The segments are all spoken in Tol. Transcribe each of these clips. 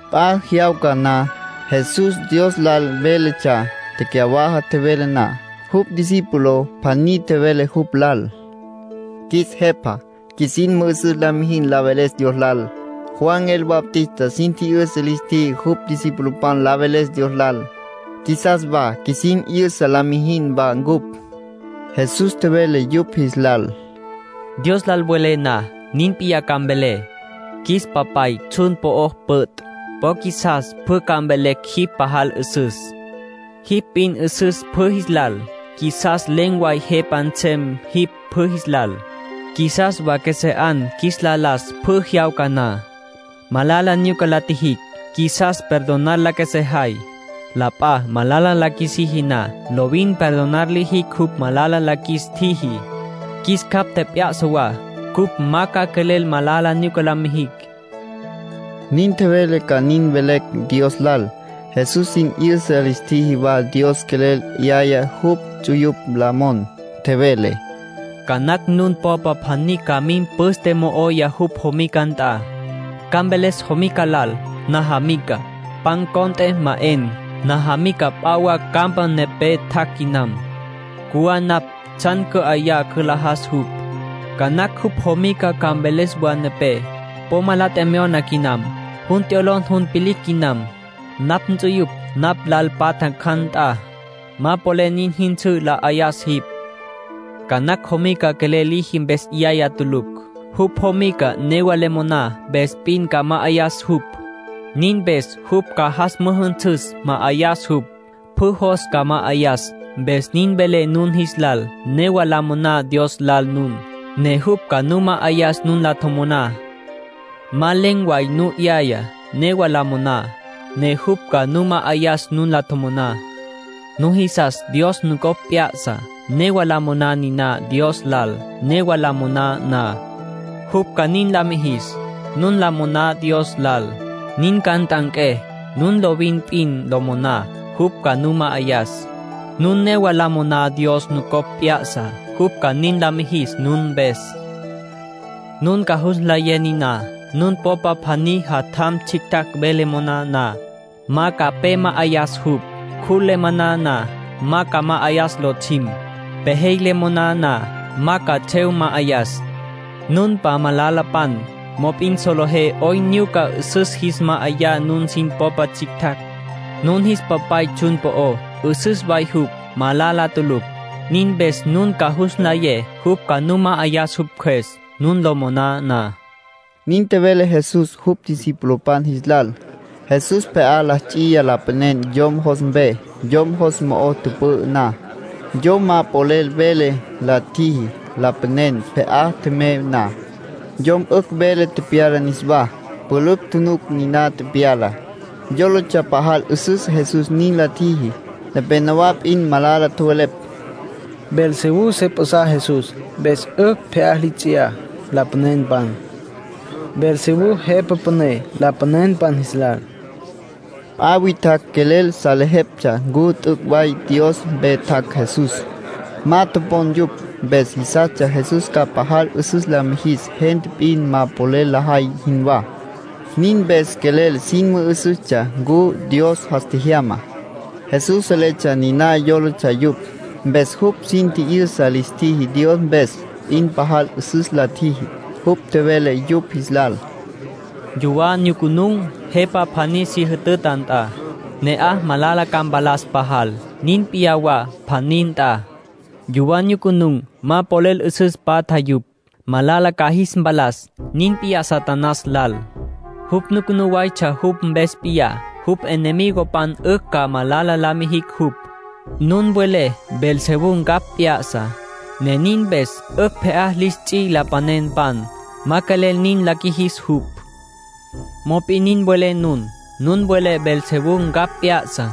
P'a jyawca na, Jesús Dios lal véletsja. Tecyawaja tjevele na, jupj discípulo pjaní tjevele jupj lal: —Qjuis Jepa, qjuisin mü'üsüs la mijin la veles Dios lal. Juan el Bautista sin tji'yüsa lis tjiji jupj discipulopan la veles Dios lal. Qjuisas wa qjuisin 'yüsa la mijin wa ncupj. Jesús tjevele yupj jis lal: —Dios lal welé na, nin p'iyá ca mvelé: ‘Qjuis Papay, tsjun po'o püt'. Po qjuisas pjü ca mvelecj jipj pajal 'üsüs. Jipj p'in 'üsüs pjü jis lal. Qjuisas len̈ way Jepa nsem jipj pjü jis lal. Qjuisas wa qjuesé 'an qjuis la las pjü jyawca na. Malala nyuca la tjijicj, qjuisas perdonar la qjuesejay. La p'a malala la qjuisiji na, lovin perdonar lijicj jupj malala la qjuis tjiji. Qjuis capj tjep'ya'sa wa cupj ma ca quelel malala nyuca la mijicj’ —nin tjevele ca nin mvelecj Dios lal. Jesús sin 'yüsa lis tjiji wa Dios quelel 'yaya jupj ts'uyupj la mon. Tjevele: —Ca nacj nun popa pjaní ca mim püste mo'oya jupj jomica nt'a. Ca mveles jomica lal: ‘Najamica, pan cont'e ma 'en. Najamica p'a wa campa nepé tjac' quinam. Cjuwá napj tsjan cü'ayá, cülajas jupj.’ ”Ca nacj jupj jomica ca mveles wa nepé: ‘Po ma la tjemyona quinam. Jun t'yolon jun vilicj quinam. Napj nts'uyupj napj lal patja ncjan nt'a. Ma polel nin jyünsǘ la 'ayas jipj.’ Ca nacj jomica quelel liji mpes 'yaya tulucj. Jupj jomica newa le moná mpes p'in ca ma'ayas jupj. Nin mpes jupj ca jas müjünsüs, ma'ayas jupj. Pjü jos ca ma'ayas. Mpes nin velé nun jis lal, newa la moná Dios lal nun, ne jupj ca nu ma'ayas nun la tjomoná. Ma len̈ way nu 'yaya, newa la moná, ne jupj ca nu ma'ayas nun la tjomoná. Nujisas Dios nucopj mp'a'sas, newa la moná niná Dios lal. Newa lo moná na, jupj ca nin la mijis. Nun lo moná Dios lal, nin ca nt'anqué. Nun lovin p'in lo moná, jupj ca nu ma'ayas. Nun newa lo moná Dios nucopj mp'a'sas, jupj ca nin la mijis nun mpes. ”Nun ca jus nlayé niná. Nun popa pjaní jatjam tsjicj ve le moná na, ma ca pe ma'ayas jupj. Cjul le moná na, ma ca ma'ayas lotsjim. Pejey le moná na, ma ca tsjev ma'ayas. Nunpan malalapan, mop'in solejé 'oyn nyuca 'üsüs jis ma'ayá nun sin popa tsjictjacj. Nun jis Papay tsjun po'ó, 'üsüs way jupj, malala tulucj. Nin mpes nun ca jus nlayé jupj ca nu ma'ayas jupj Cjües, nun lo moná na —nin tjevele Jesús jupj discipulopan jis lal. Jesús pje'á la ts'iya lapanen yom jos mpe. Yom jos mo'o tüpü'ü na, yom ma polel vele la tjiji. Lapanen pje'á tjemey na, yom 'ücj vele tepyala niswá. Pülücj tjunuc niná tepyalá. Yólatsja pajal 'üsüs Jesús nin la tjiji. Nepénowa p'in malala tjowelepj: “Beelzebú se p'a'sa Jesús, mpes 'ücj pje'á li ts'iyá lapanenpan. Beelzebú jepa püné lapanenpan jis lal.” P'a witjacj quelel salejeptsja ncu t'üc' way Dios mpe tjac' Jesús. Ma topon yupj. Mpes jisastsja Jesús ca pajal 'üsüs la mijis gente p'in ma polel lajay jinwá. Nin mpes quelel sin mü'üsüstsja ncu Dios jas tjejyama. Jesús seletsja niná yólatsja yupj. Mpes jupj sin tji'yüsa lis tjiji Dios mpes p'in pajal 'üsüs la tjiji. Jupj tjevele yupj jis lal: “Yuwá nyucunun̈ jepa pjaní si jütüta nt'a, ne'aj malala ca mpalas pajal. Nin p'iyá wa pjaní nt'a. Yuwá nyucunun̈, ma polel 'üsüs patja yupj. Malala ca jis mpalas. Nin p'iyá Satanás lal. Jupj nucunú waytsja jupj mpes p'iyá, jupj enemigopan 'ücj ca malala la qjuijicj jupj. Nun welé Beelzebú ncapj p'ya'sa, ne nin mpes 'ücj pje'á lis ts'i lapanenpan. Ma quelel nin la qjuijis jupj. Mop'in nin welé nun. Nun welé Beelzebú ncapj p'ya'sa.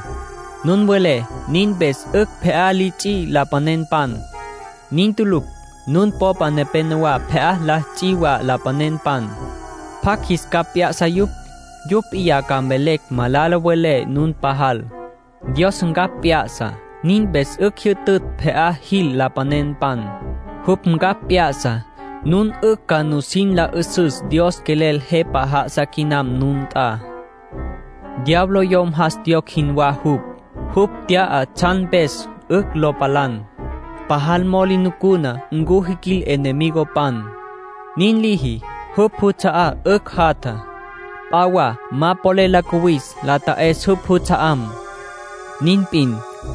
Nun welé nin mpes 'ücj pje'á li ts'i lapanenpan. Nin tulucj. Nun popa nepenowá pje'á la ts'i wa lapanenpan. ¿Pjacj jis capj p'ya'sa yupj? Yupj p'iyá ca mvelecj malala welé nun pajal. Dios ncapj p'ya'sa. Nin mpes 'ücj jyütütj pje'á jil lapanenpan. Jupj ncapj p'ya'sa, nun 'ücj ca nusin la 'üsüs Dios quelel Jepa já'asa quinam nun nt'a. ”Diablo yom jas tjiyocj jinwá jupj. Jupj tya'a tsjan mpes 'ücj lo palan. Pajal mo'o li nucuna ncu jiquil enemigopan. Nin liji, jupj juts'a'á 'ücj jatja. P'a wa ma polel lo cuwis la ta'es jupj juts'a'am. Nin p'in,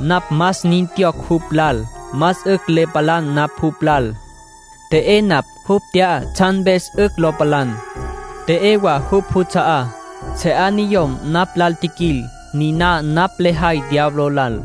napj más nin tjiyocj jupj lal, más 'ücj le palan napj jupj lal. T'e'é napj jupj tya'á tsjan mpes 'ücj lo palan, t'e'é wa jupj juts'a'á. Se 'a niyom napj lal tjiquil. Niná napj lejay diablo lal.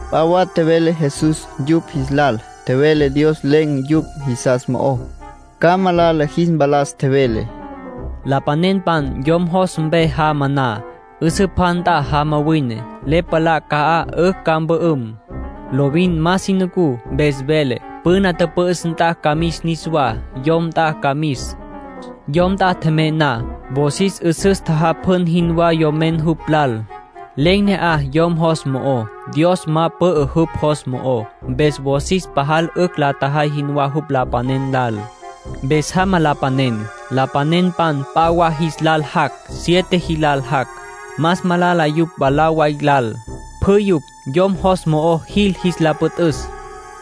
P'a wa tjevele Jesús yupj jis lal. Tjevele Dios len̈ yupj jisas mo'ó, ca malala jis mpalas. Tjevele: “Lapanen yom jos mpe jama na, 'üsǘ pja nt'a jama wine. Le palá ca'aj 'ücj ca mpü'üm. Lovin ma si nucú, mpes vele: ‘Püna tüpü'üs nt'a ca mis niswá. Yom nt'a ca mis.’ Yom nt'a tjemey na, wosis 'üsüs la tjajapjun jinwá yomen jupj lal. Len̈ ne'aj yom jos mo'ó. Dios ma pü'ü jupj jos mo'ó. Mpes wosis pajal 'ücj la tjajay jinwá jupj lapanen lal. Mpes jama lapanen. Lapanenpan p'a wa jis lal jac'. Siete jilal jac'. Más malala yupj mwalá way lal. Pjü yupj yom jos mo'o jil jis la püt'üs.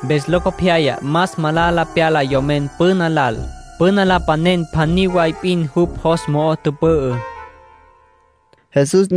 Mpes locopyaya más malala pyala yomen püna lal. Püna lapanen pjaní way p'in jupj jos mo'o tüpü'ü”, nin tjevele Jesús.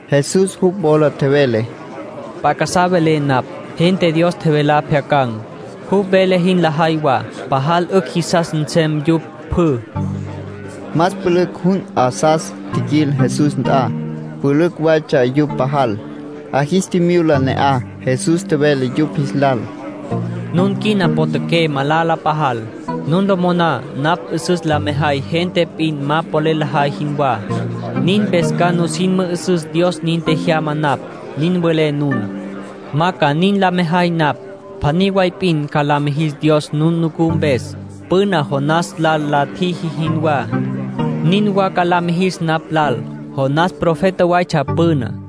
Jesús jupj wola tjevele: —P'a casá velé napj. Gente Dios tjevelá pjyacan̈, jupj vele jin lajay wa, pajal 'ücj jisas nsem yupj pjü. Más pülücj jun 'asas tjiquil Jesús nt'a. Pülücj waytsja yupj pajal. 'A jis tjimyula ne'aj. Jesús tjevele yupj jis lal: “Nun quina potjaqué malala pajal. Nun lo moná napj 'üsüs la mejay gente p'in ma polel lajay jinwá. Nin mpes ca nusin mü'üsüs Dios nin tjejyama napj, nin welé nun. Ma ca nin la mejay napj. Pjaní way p'in ca la mijis Dios nun nucú mpes. Püna Jonás lal la tjiji jinwá, nin wa ca la mijis napj lal. Jonás profeta waytsja püná.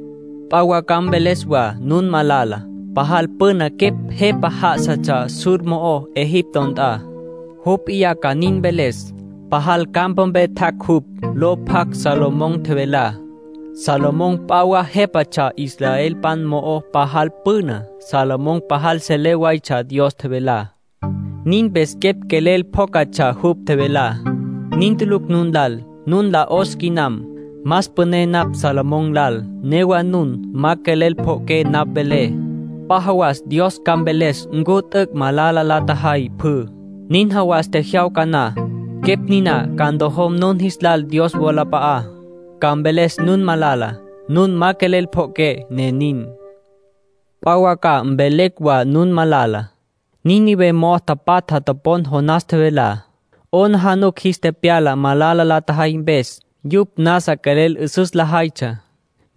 ”P'a wa ca mveles wa nun malala. Pajal püna quepj jepa já'asatsja Sur mo'ó Egipto nt'a. Jupj p'iyá ca nin mveles. Pajal campa mpe tjac' jupj lo pjac Salomón tjevelá. Salomón p'a wa jépatsja Israel mo'ó pajal püna. Salomón pajal selé waytsja Dios tjevelá. Nin mpes quepj quelel pjócatsja jupj tjevelá. Nin tulucj nun lal. Nun lal 'os quinam. Más püné napj Salomón lal. Newa nun ma quelel pjo'oqué napj velé. P'a jawas Dios ca mveles ncu t'üc' malala la tjajay pjü. Nin jawas tjejyawca na, quepj niná ca ntojom nun jis lal Dios wolap'a'á. Ca mveles nun malala. Nun ma quelel pjo'oqué, ne nin. ”P'a wa ca mvelecj wa nun malala. Nínive mo'o tapatja topon Jonás tjevelá. 'Aplijila jis tepyala malala la tjajay mpes. Yupj nasa quelel 'üsüs lajaytsja.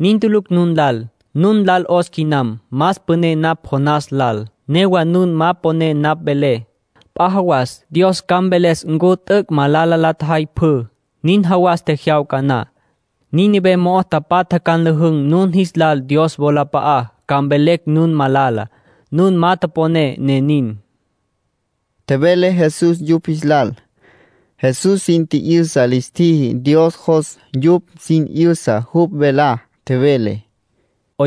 Nin tulucj nun lal. Nun lal 'os quinam. Más püné napj Jonás lal. Newa nun ma poné napj velé. P'a jawas Dios ca mveles ncu t'üc' malala la tjajay pjü. Nin jawas tjejyawca na, Nínive mo'o tapatja ca nlüjün̈ nun jis lal Dios wolap'a'á, ca mvelecj nun malala. Nun ma poné, ne nin”, tjevele Jesús yupj jis lal. Jesús sin tji'yüsa lis tjiji Dios jos yupj sin 'yüsa jupj velá. Tjevele: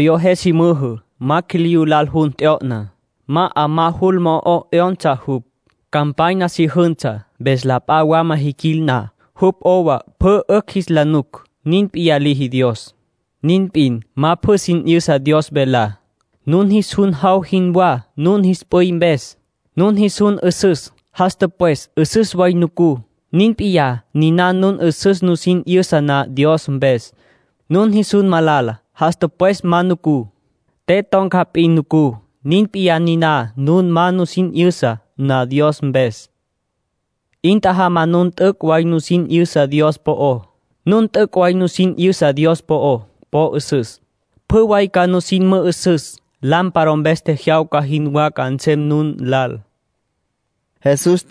“Yo je si müjü, ma quiliyú lal jun t'yo'na. Ma 'amá jul mo'o 'yonsa jupj. Campanya si jünsa, mpes la p'a wama jiquil na, jupj 'owa pjü 'ücj jis la nuc. Nin p'iyá liji Dios. Nin p'in, ma pjü sin 'yüsa Dios velá. Nun jis jun jaw jinwá nun jis p'üy mpes. Nun jis jun 'üsüs, jas tüpwes 'üsüs way nucú. Nin p'iyá niná nun 'üsüs nusin 'yüsa na Dios mpes. Nun jis jun malala, jas tüpwes ma nucú. Te ton̈ca p'in nucú. Nin p'iyá niná nun ma nusin 'yüsa na Dios mpes. 'In tjajama nun t'üc' way nusin 'yüsa Dios po'ó. Nun t'üc' way nusin 'yüsa Dios po'ó, po 'üsüs. Pjü way ca nusin mü'üsüs. Lámpara mpes tjejyawca jinwá ca nsem nun lal”, tjevele Jesús.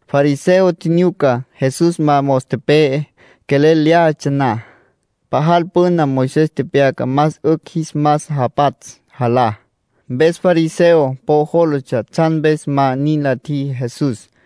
Fariseo tjinyuca Jesús ma mos tepe'e quelel lyájatsja na. Pajal püna Moisés tepyaca más 'ücj jis mas japatsj jalá. Mpes fariseo po jólatsja tsjan mpes ma nin la tjiji Jesús.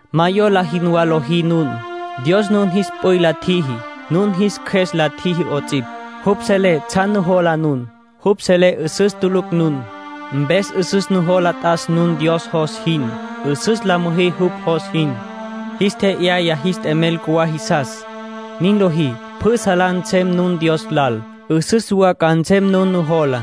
Ma yola jinwá lojí nun. Dios nun jis p'üy la tjiji. Nun jis qjues la tjiji 'ots'ipj. Jupj selé tsjan nujola nun. Jupj selé 'üsüs tulucj nun. Mpes 'üsüs nujola t'as nun Dios jos jin. 'Üsüs la müjí jupj jos jin. Jis tje'yayá jis t'emel cjuwá jisas. Nin lojí, pjü salá nsem nun Dios lal. 'Üsüs wa ca nsem nun nujolá.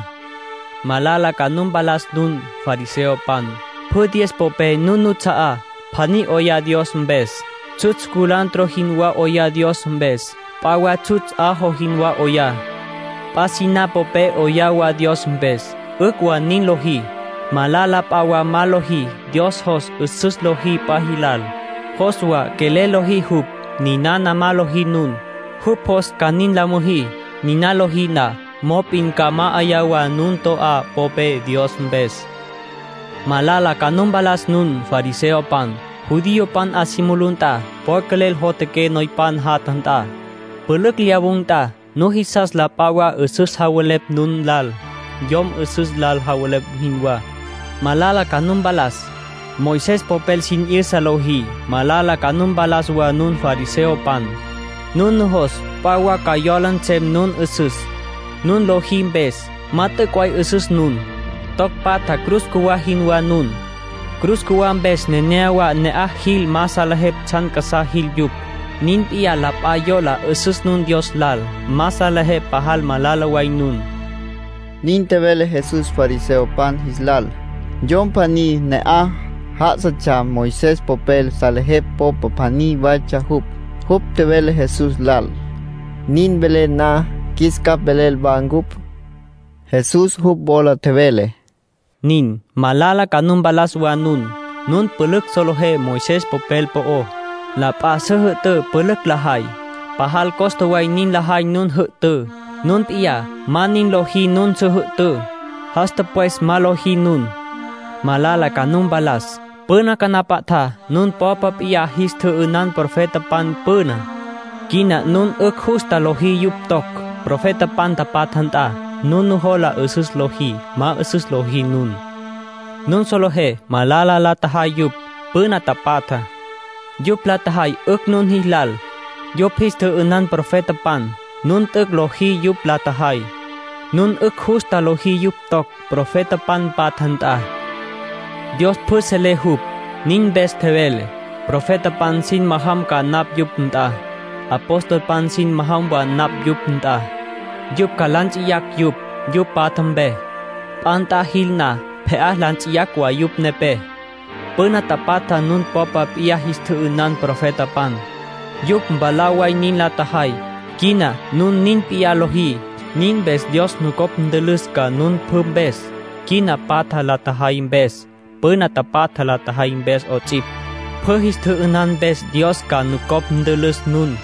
”Malala ca nu mpalas nun, fariseopan. Pjü diez popé nun nuts'a'á, pjaní 'oyá Dios mpes. Tsjutsj culantro jinwá 'oyá Dios mpes. P'a wa tsjutsj ajo jinwá 'oyá. P'a siná popé 'oyá wa Dios mpes. 'Ücj wa nin lojí. Malala p'a wa ma lojí. Dios jos 'üsüs lojí p'a jilal. Jos wa quelel lojí jupj. Ninana ma lojí nun. Jupj jos ca nin la müjí. Niná lojí na, mop'in ca ma'ayá wa nun to'á popé Dios mpes. ”Malala ca nu mpalas nun, fariseopan. Judiopan 'a si mulú nt'a po quelel jotjaqué noypan jatja nt'a. Pülücj lyawun̈ nt'a, nujisas la p'a wa 'üsüs javelepj nun lal, yom 'üsüs lal javelepj jinwá. ”Malala ca nu mpalas, Moisés popel sin 'yüsa lojí. Malala ca nu mpalas wa nun fariseopan. Nun nujos p'a wa ca yola nsem nun 'üsüs, nun lojí mpes. Ma t'üc' way 'üsüs nun. Toc patja cruz cjuwá jinwá nun. Cruz cjuwá mpes nenéyawa ne'aj jil ma salejepj tsjan casá jil yupj. Nin p'iyá la p'a yola 'üsüs nun Dios lal. Ma salejepj pajal malala way nun —nin tjevele Jesús fariseopan jis lal. Yom pjaní ne'aj já'asatsja Moisés popel salejepj popa pjaní waytsja jupj. Jupj tjevele Jesús lal: —Nin velen na, qjuis capj velel wa ncupj. Jesús jupj wola tjevele: —Nin. Malala ca nu mpalas wa nun, nun pülücj solejé Moisés popel po'ó. La p'a su jü'tǘ pülücj lajay. Pajal costa way nin lajay nun jü'tǘ. Nun p'iyá ma nin lojí nun su jü'tǘ. Jas tüpwes ma lojí nun. ”Malala ca nu mpalas. Püna canapatjá nun popa p'iyá jis tjü'ünan profetapan püná. Quina nun 'ücj justa lojí yupj toc, profetapan patja nt'a. Nun nujola 'üsüs lojí, ma 'üsüs lojí nun. Nun solejé malala la tjajay yupj, püna tapatjá. Yupj la tjajay 'ücj nun jilal. Yupj jis tjü'ünan profetapan. Nun t'üc' lojí yupj la tjajay. Nun 'ücj justa lojí yupj toc, profetapan patja nt'a. ”Dios pjü selé jupj. Nin mpes tjevele: ‘Profetapan sin majam ca napj yupj nt'a. Apostolpan sin majam wa napj yupj nt'a. Yupj ca la nts'iyacj yupj, yupj patja mpe. P'a nt'a jil na, pje'á la nts'iyacj wa yupj nepé.’ Püna tapatja nun popa p'iyá jis tjü'ünan profetapan. Yupj mwalá way nin la tjajay. Quina nun nin p'iyá lojí. Nin mpes Dios nucopj ntülüs ca nun pjü mpes, quina patja la tjajay mpes, püna tapatja la tjajay mpes 'ots'ipj. Pjü jis tjü'ünan mpes Dios ca nucopj ntülüs nun.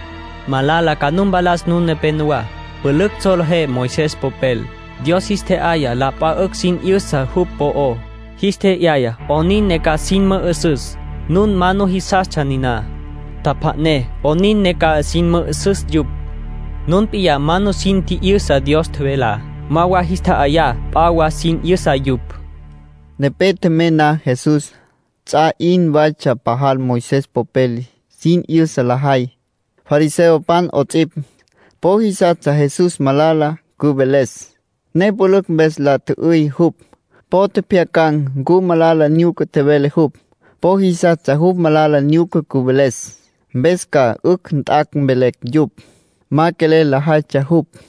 ”Malala ca nu mpalas nun nepenowá, pülücj solejé Moisés popel. Dios jis tje'yaya la p'a 'ücj sin 'yüsa jupj po'ó. Jis tje'yaya 'onin ne ca sin mü'üsüs. Nun ma nujisastsja niná. Tjapja'né 'onin ne ca sin mü'üsüs yupj. Nun p'iyá ma nusin tji'yüsa Dios tjevelá, ma wa jis tja'ayá p'a wa sin 'yüsa yupj —tjevele Jesús. Nepé tjemey na Jesús, ts'a 'in waytsja pajal Moisés popel sin 'yüsa lajay, fariseopan 'ots'ipj. Po jisastsja Jesús malala cüveles, ne pülücj mpes la tjü'üy jupj. Po tjepjyacan̈ ncu malala nyuca tjevele jupj. Po jisastsja jupj malala nyuca cüveles, mpes ca 'ücj jat' mvelecj yupj. Ma quelel lajaytsja jupj.